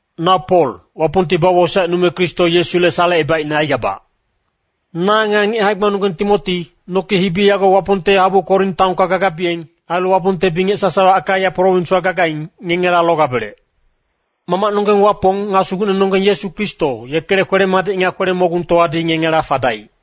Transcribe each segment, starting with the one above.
Na Pol, Wapongti bawosaecnume Kristo Yesule salecebaicne aigabac. Na nga ngic hae-gbanonggeng Timoti, noki hibi yago Wapongte habu Korin taonka gagabiyeng, ailu Wapongte bingec sasawa Akaia prowinswa gagaing, ngengela logabelec. Mamacnonggeng Wapong nga Sugucnenonggeng Yesu Kristo, yekele kwele-madic nga kwele-mogungtowadi ngengela fadaic.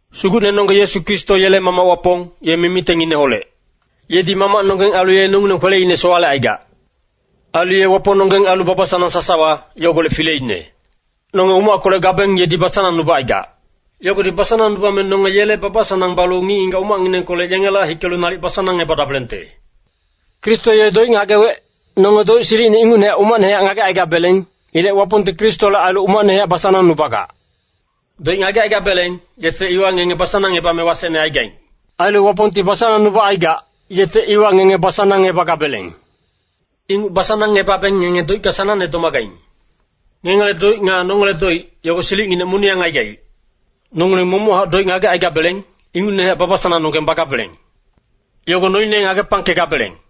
Sugucnenonggeng Yesu Kristo yele Mamac Wapong, ye mimitengineholec. Yedi Mamacnonggeng ailu ye nongileng kweleine sowalecaigac. Ailu ye Wapongnonggeng ailu baba-sanang sasawa, yogolec fileine. Nonge umackolec gabeng yedi basanangnubacaigac. Yogodi basanangnubame nonge yele baba-sanang balu ngic-ngigac umacnginengkolec yengela hikelu nalic basanangebadabelengte. Kristo ye doic ngagewec, nonge doic silicine ingucne umacnehac ngagecaigabeleng. Ilec Wapongti Kristole ailu umacnehac basanangnubagac. Doic ngagecaigabeleng, yefe iwa ngenge basanangngebame wasecne aigaing. Ailu Wapongti basanangnubacaigac, yefe iwa ngenge basanangngebagabeleng. Inguc basanangngebabeng ngenge doicka sanangne domagaing. Ngengele doic nga nongele doic, yogo silicnginec moniyang aigaic. Nongileng momochac doic ngagecaigabeleng, ingucnehac baba-sanangnonggeng bagabeleng. Yogo noine ngagepangkegabeleng.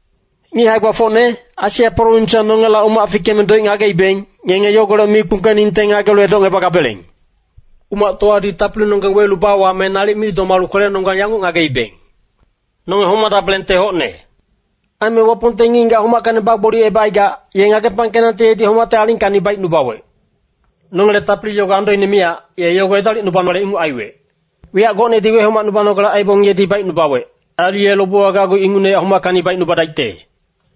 Ngic hae-gbafocne, Asia prowinswa nongela umac fikeme doic ngageibeng, ngenge yogolec mi kpungkeningte ngagelu edocngebagabeleng. Umactowadi tapilinonggeng welu bawame nalic mi domalu kwelenonggang yanguc ngageibeng, “Nonge homadabelengte hocne.” Aime Wapongti ngic-ngigac homackacni bagboliyecebacaigac, ye ngagepangkenangte yedi homacte alingkacni baicnubawec. Nongele tapili yogo andoine miyac, ye yogo edalicnubanale inguc aiwec. Wiyac gocnedi wehomacnubanogale aibong yedi baicnubawec. Ailu ye lobewa gacgu ingucnehac homackacni baicnubadaicte.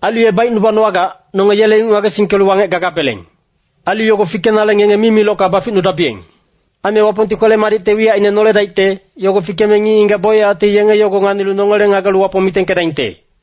Ailu baicnubanowagac, nonge yele inguc ngagesingkelu wangec gagabeleng. Ailu yogo fikenale ngenge mimilocka baficnubadabiyeng. Aime Wapongti kwele-madicte wiyacine noledaicte, yogo fikeme ngic-ngigac bocyacti yenge yogo nganilu nongele ngagelu Wapong mitengkedaingte.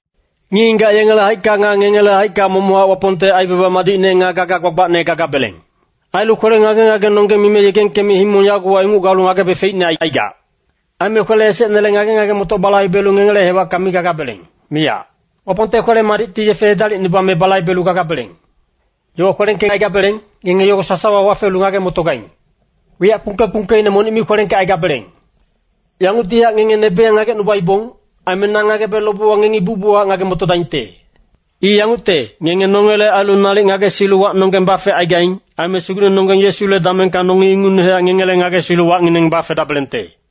Ngic-ngigac yengele haicka nga ngengele haicka momochac Wapongte aibaba madicne nga gaga gbagbacne gagabeleng. Ailu kwele ngage-ngagenonggeng mime yegengkeme himong yagowa inguc galu ngagebe feicne aicaigac. Aime kwele esecnele ngage-ngage-motoc balaibelu ngengele hewacka mi gagabeleng, miyac. Wapongte kwele-madicti yefe edalicnubame balaibelu gagabeleng. Yowa kwelengkecaigabeleng, ngenge yogo sasawa wafelu ngage-motogaing. Wiyac kpungke-kpungkeine monic mi kwelengkecaigabeleng. Yanguctihac ngenge nebeyang ngagecnubaibong. Aime na ngagebe lobewa ngengi bucbuchac ngage-motodaingte. I yangucte, ngenge nongele ailu nalic ngagesilu wacnonggeng bafegaing. Aime Sugucnenonggeng Yesule damengka nongi ingucnehac ngengele ngagesilu wacngineng bafedabelengte.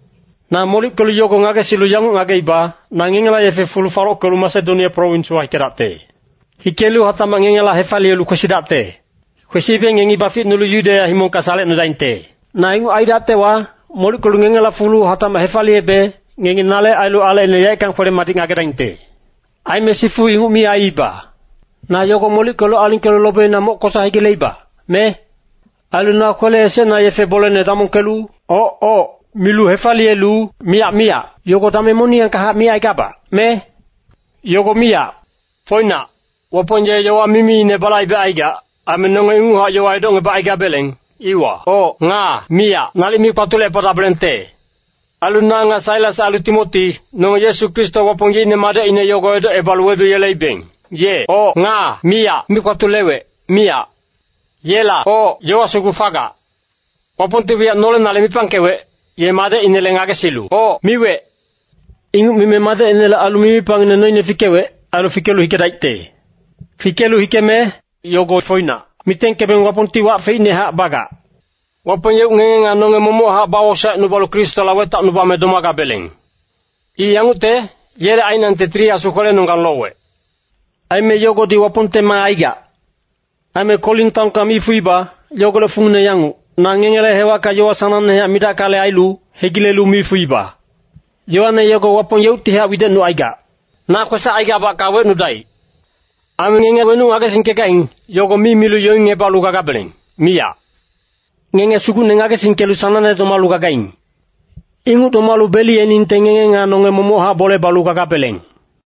Na molickelu yogo ngagesilu yanguc ngageiba, na ngengela yefe fulu falockelu Masedonia prowinswa hikedacte. Hikelu hatacmac ngengela hefaliyelu kwesidacte. Kwesibe ngengi baficnulu Yudeya himongka salecnudaingte. Na inguc aidactewa, molickelu ngengela fulu hatacmac hefaliyebe, ngengi nale ailu alecine yaeckang kwele-madic ngagedaingte. Aime sifu inguc mi aiiba. Na yogo molickelu alingkelu lobeina moc kosa hegileiba, me? Ailu na kwele esecna yefe bolene damongkelu “oc, oc,” milu hefaliyelu “miyac, miyac,” yogo dameng moniyangkahac micaigabac, me? Yogo miyac! Foinac, Wapong ye yowa mimiine balaibecaigac. Aime nonge ingucnehac yowa edocngebacaigabeleng, iwa “oc” nga “miyac” nalic mi kpatulecepadabelengte. Ailu na nga Sailas ailu Timoti, nonge Yesu Kristo Wapong yeicne Madecine yogo edocngebalu wedungeleibeng, ye “oc” nga “miyac” mi kpatulewec, miyac. Yela “oc” yowa sugu fagac. Wapongti wiyac nolenale mipangkewec, ye Madecinele ngagesilu “oc” miwec. Inguc mime Madecinele ailu mimipangngine noine fikewec, ailu fikelu hikedaicte. Fikelu hikeme “yogo foinac” mitengkebeng Wapongti wac feicnehac bagac. Wapong yeuc ngenge nga nonge momochac bawosaecnubalu Kristola wetacnubame domagabeleng. I yangucte, yele ainangte Tili Asu kwelenonggang lowec. Aime yogodi Wapongte maa aigac. Aime Korin taonka mi fuiba, yogolec fungine yanguc, na ngengele hewacka yowa sanangnehac midackale ailu, hegilelu mi fuiba. Yowane yogo Wapong yeuctihac widecnucaigac. Na kwesac aigabacka wecnudaic. Aime ngenge wenuc ngagesingkegaing, yogo mi milu yoingngebalu gagabeleng, miyac. Ngenge Sugucne ngagesingkelu sanangne domalu gagaing. Inguc domalu beliyeningte ngenge nga nonge momochac bole balu gagabeleng.